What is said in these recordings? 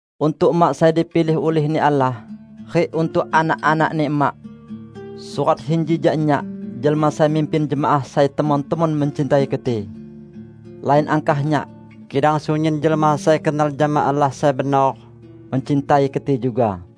Untuk Emak sai dipilih ulih-Ni Allah, rik untuk anak-anakni Emak. Surat inji jak nyak, jelma sai mimpin jemaah sai temon-temon mencintai keti. Lain angkah nyak, kidang sunyin jelma sai kenal jama Allah sai benor, mencintai keti juga.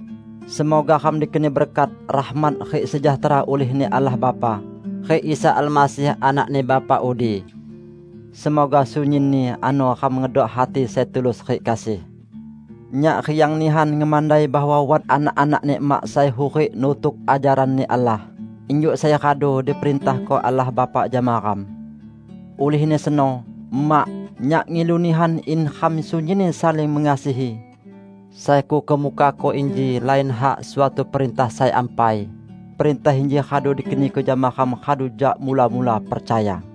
Semoga ram dikeni berkat, rahmat rik sejahtera ulih-Ni Allah Bapa, rik Isa Almasih Anak-Ni Bapa udi. Semoga sunyinni ano ram ngedok hati sai tulus rik kasih. Nyak riang nihan ngemandai bahwa wat anak-anakni Emak sai hurik nutuk ajaran-Ni Allah, injuk sai radu diperintahko Allah Bapa jama ram. Ulihni seno, Emak, nyak ngilu nihan in ram sunyinni saling mengasihi. Sai kukemukako inji lain hak suatu perintah sai ampai; perintah inji radu dikeniko jama ram radu jak mula-mula percaya.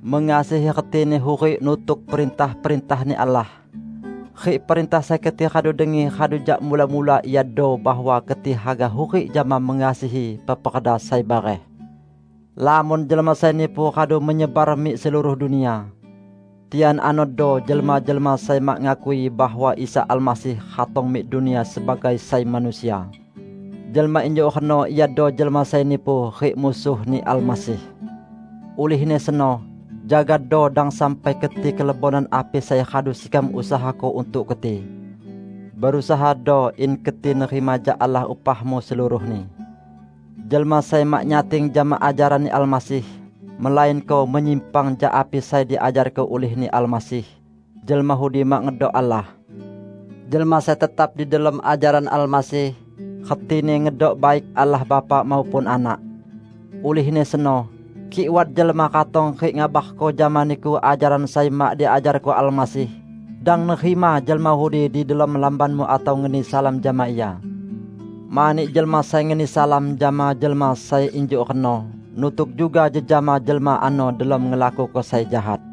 Mengasihi retini hurik nutuk perintah-perintah-Ni Allah. Rik perintah sai keti radu dengi radu jak mula-mula iado bahwa keti haga hurik jama mengasihi peperda sai bareh. Lamon jelma sai nipu radu menyebar mik seluruh dunia. Tian anodo jelma-jelma sai mak ngakui bahwa Isa Almasih ratong mik dunia sebagai sai manusia. Jelma injuk reno iado jelma sai nipu, rik Musuh-Ni Almasih. Ulihni seno, jagado dang sampai keti kelebonan api sai radu sekam usahako untuk keti. Berusahado in keti nerima jak Allah upahmu seluruhni. Jelma sai mak nyating jama ajaran-Ni Almasih, melainko menyimpang jak api sai diajarko ulih-Ni Almasih, jelma udi mak ngedok Allah. Jelma sai tetap di delom ajaran Almasih, retini ngedok baik Allah Bapa maupun Anak. Ulihni seno, kik wat jelma ratong rik ngabarko jama niku ajaran sai mak diajarko Almasih, dang nerima jelma udi di delom lambanmu atau ngeni salam jama ia. Mani jelma sai ngeni salam jama jelma sai injuk reno nutuk juga jejama jelma ano delom ngelakuko sai jahat.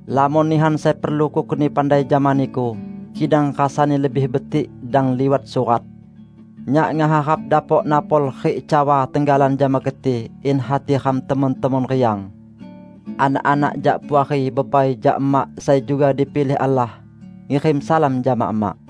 Lamon nihan sai perlu kukeni pandai jama niku, kidang rasani lebih betik dang liwat surat. Nyak ngeharap dapok napol rik cawa tenggalan jama keti, in hati ram temon-temon riang. Anak-anak jak puari bebai jak Emak sai juga dipilih Allah, ngirim salam jama Emak.